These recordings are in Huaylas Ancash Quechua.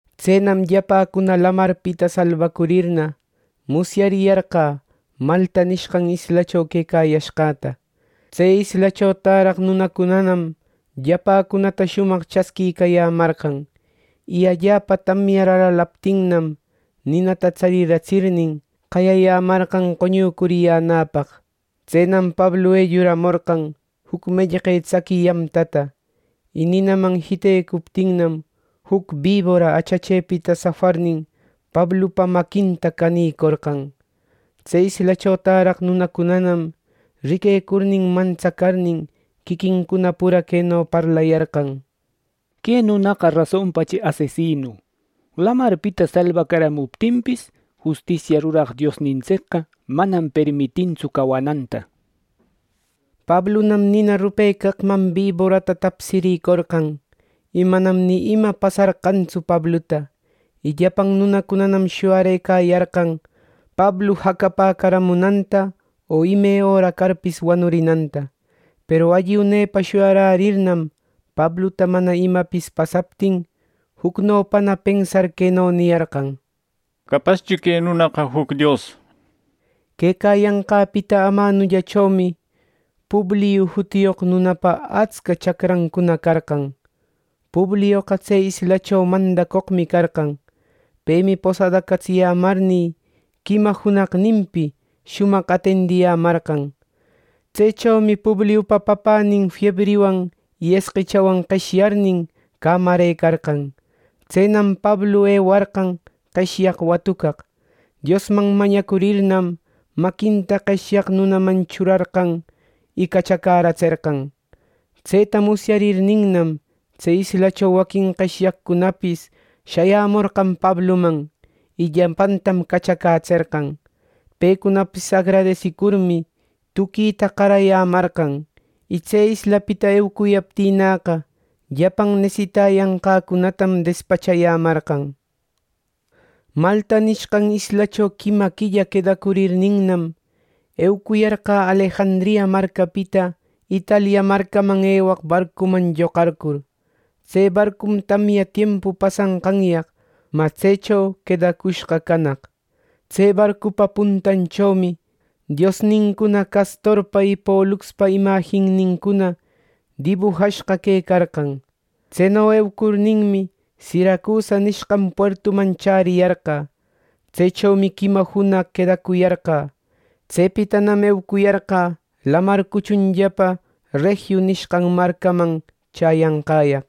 Tsenam llapäcuna lamarpita salbacurirna, musyariyarqä Malta nishqan islacho quecayashqäta. Tse islacho täraq nunacunanam llapäcunata shumaq chasquiyämarqan. Y allapa tamyar alalaptinnam, ninata tsariratsirnin qayayämarqan qoñucuriyänäpaq. Tsenam Pablu elluramorqan juc mellqe tsaqui yamtata. Y ninaman jitecuptinnam, juc bibora achachepita safarnin, Pablupa maquinta canïcorqan. Tse islacho täraq nunacunanam riquecurnin, mantsacarnin quiquincuna pura queno parlayarqan: “Que nunaqa rasonpachi asesinu. Lamarpita salbacaramuptinpis Justisia ruraq Diosnintsicqa manam permitintsu cawananta” nir. Pablunam nina rupecaqman biborata tapsirïcorqan, y manam ni ima pasarqantsu Pabluta. Y llapan nunacunam shuyarëcayarqan Pablu jacapäcaramunanta o ime öra carpis wanurinanta. Peru alli unepa shuyararirnam, Pabluta mana imapis pasaptin jucnopana pensar queno niyarqan: —Capaschi que nunaqa juc dios —nishpa. Quecayanqäpita amanullachomi Publiu jutiyoq nunapa atsca chacrancuna carqan. Publioqa tse islacho mandacoqmi carqan. Pemi posadacatsiyämarnï, quima junaqninpi shumaq atendiyämarqan. Tsechomi Publiupa papänin fiebriwan y esqechawan qeshyarnin cämarëcarqan. Tsenam Pablu ewarqan qeshyaq watucaq. Diosman mañacurirninnam, maquinta qeshyaq nunaman churarqan y cachacäratserqan. Tseta musyarirninnam, tse islacho waquin qeshyaqcunapis shayamorqan Pabluman, y llapantam cachacätserqan. Pecunapis agradesicurmi, tuquita qarayämarqan. Y tse islapita eucuyaptïnäqa, llapan nesitayanqäcunatam despachayämarqan. Malta nishqan islacho quima quilla quedacurninnam, eucuyarqä Alejandria marcapita Italia marcaman ewaq barcunam lloqarcur. Tse barcum tamya tiempu pasanqanyaq mä tsecho quedacushqa canaq. Tse barcupa puntanchomi diosnincuna Castorpa y Poluxpa imajinnincuna dibujashqa quecarqan. Tseno eucurninmi, Siracusa nishqan puertuman chäriyarqä. Tsechomi quima junaq quedacuyarqä. Tsepitanam eucuyarqä lamar cuchunllapa Regiu nishqan marcacama chäyanqäyaq.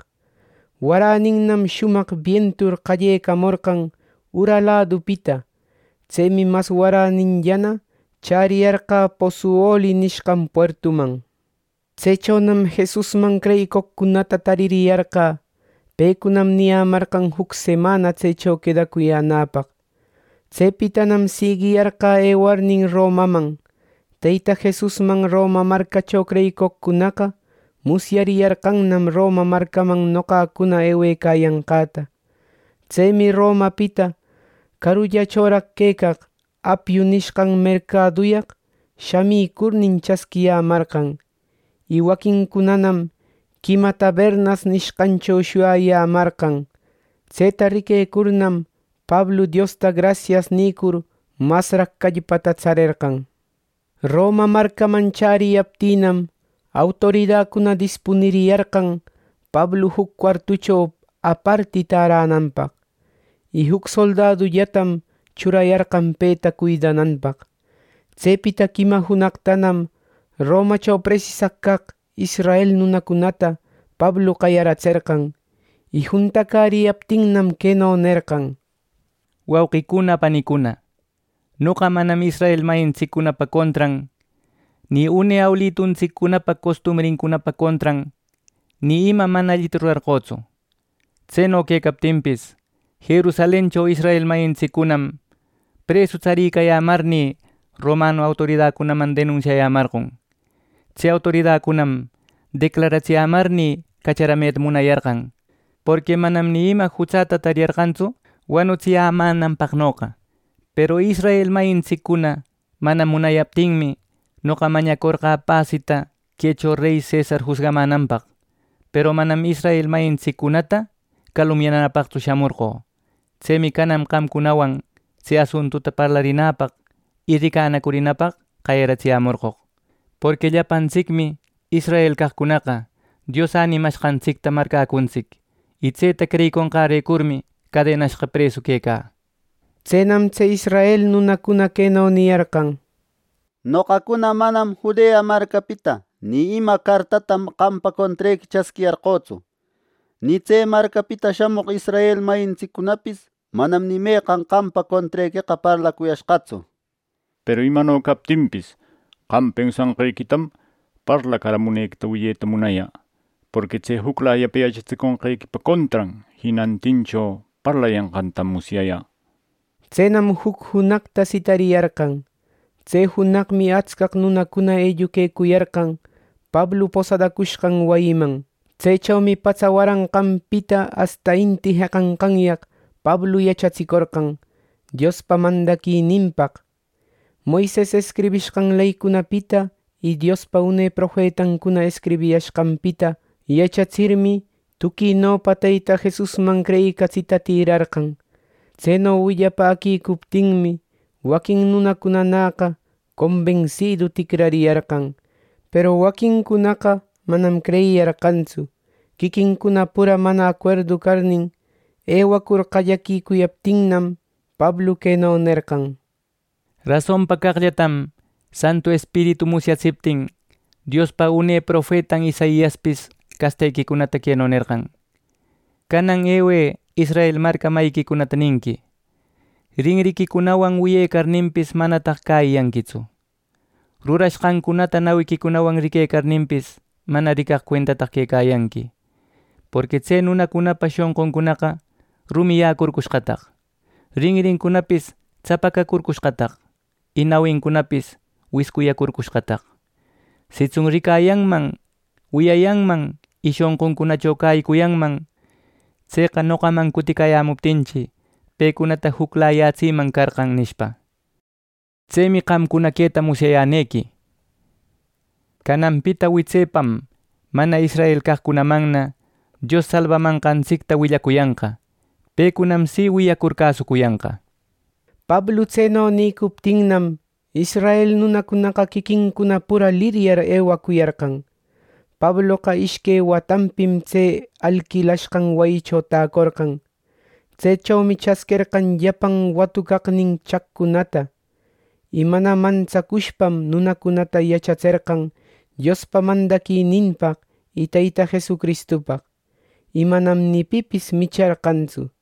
Waräninnam shumaq bientur qallecamorqan ura ladupita. Tsemi mas waräninllana chäriyarqä Pozzuoli nishqan puertuman. Tsechonam Jesusman creyicoqcunata tariyarqä. Pecunam niyämarqan juc semana tsecho quedacuyänäpaq. Tsepitanam siguiyarqä ewarnin Romaman. Teyta Jesusman Roma marcacho creyicoqcunaqa musyariyarqannam Roma marcaman noqacuna ewecayanqäta. Tsemi Romapita carullachoraq quecaq Apiu nishqan mercaduyaq shamicurnin chasquiyämarqan. Y waquincunanam Quima Tabernas nishqancho shuyayämarqan. Tseta riquecurnam, Pablu Diosta grasias nïcur masraq callpata tsarerqan. Roma marcaman chäriyaptïnam, autoridacuna dispuniriyarqan Pablu juc cuartucho aparti täränanpaq. Y juc soldadullatam churayarqan peta cuidananpaq. Tsepita quima junaqtanam Romacho presisaq caq israel nunacunata Pablu qayaratserqan. Y juntacäriyaptinnam queno nerqan: —Wauquicuna, panicuna, noqa manam israel mayintsiccunapa contran, ni une awiluntsiccunapa costumbrincunapa contran, ni ima mana allita rurarqötsu. Tseno quecaptinpis, Jerusalencho israel mayintsiccunam presu tsaricayämarnï romanu autoridacunaman denunsiayämarqon. Tse autoridacunam declararatsiyämarnï cacharameta munayarqan. Porqui manam ni ima jutsäta tariyarqantsu wanutsiyämänanpaqnoqa. Peru israel mayintsiccuna mana munaptinmi, noqa mañacorqä pasita quecho rey cesar jusgamänanpaq. Peru manam israel mayintsiccunata calumniyanäpaqtsu shamorqö. Tsemi canan qamcunawan tse asuntuta parlarinäpaq y ricanacurinäpaq qayaratsiyämorqoq. Porqui llapantsicmi israel caqcunaqa, Dios änimashqantsicta marcäcuntsic. Y tseta creyiconqärecurmi, cadenashqa presu quecä —nishpa. Tsenam tse israel nunacuna queno niyarqan: —Noqacuna manam Judea marcapita ni ima cartata qampa contrequi chasquiyarqötsu, ni tse marcapita shamoq israel mayintsiccunapis manam ni meqan qampa contrequeqa parlacuyashqatsu. Peru imano captinpis, qam pensashqequitam parlacaramunequita wiyeta munayä, porqui tse juclayapa yachatsiconqequipa contran jinantincho parlayanqantam musyayä —nishpa. Tsenam juc junaqta sitariyarqan. Tse junaqmi atscaq nunacuna elluquecuyarqan Pablu posadacushqan wayiman. Tsechomi patsa waranqanpita asta inti jeqanqanyaq Pablu yachatsicorqan, Diospa mandaquininpaq. Moises escribishqan leycunapita y Diospa une profetancuna escribiyashqanpita yachatsirmi, tuquinopa Teyta Jesusman creyicatsita tïrarqan. Tseno willapäquicuptinmi, waquin nunacunaqa combensidu ticrariyarqan, peru waquincunanaqa manam creyiyarqantsu. Quiquincuna pura mana acuerdu carnin, ewacur qallecuyaptinnam, Pablu queno nerqan: —Rasonpa caqllatam Santu Espiritu musyatsiptin, Diospa une profetan Isaiaspis castequicunata queno nerqan: ‘Canan ewë Israel marca mayiquicunata ninqui: Rinriquicunawan wiyecarninpis, manataq cäyiyanquitsu. Rurashqancunata nawiquicunawan riquecarninpis mana ricaq cuentataq quecayanqui. Porqui tse nunacunapa shonquncunaqa rumiyäcurcushqataq, rinrincunapis tsapacacurcushqataq y nawincunapis wiscuyacurcushqataq. Sitsun ricayanman, wiyayanman, y shonquncunacho cäyicuyanman. Tseqa noqaman cuticayämuptinchi, pecunata juclayatsiyäman carqä’ nishpa. Tsemi qamcuna queta musyayänequi: Cananpita witsepam mana israel caqcunamanna Dios salbamanqantsicta willacuyanqa. Pecunam si wiyacur cäsucuyanqa. ˻Pablu tseno nïcuptinnam, israel nunacunaqa quiquincuna pura liryar ewacuyarqan.˼ Pabloqa ishque watanpim tse alquilashqan wayicho tacorqan. Tsechomi chasquerqan llapan watucaqnin chaqcunata. Y mana mantsacushpam nunacunata yachatserqan Diospa mandaquininpaq y Teyta Jesucristupaq. Y manam ni pipis micharqantsu.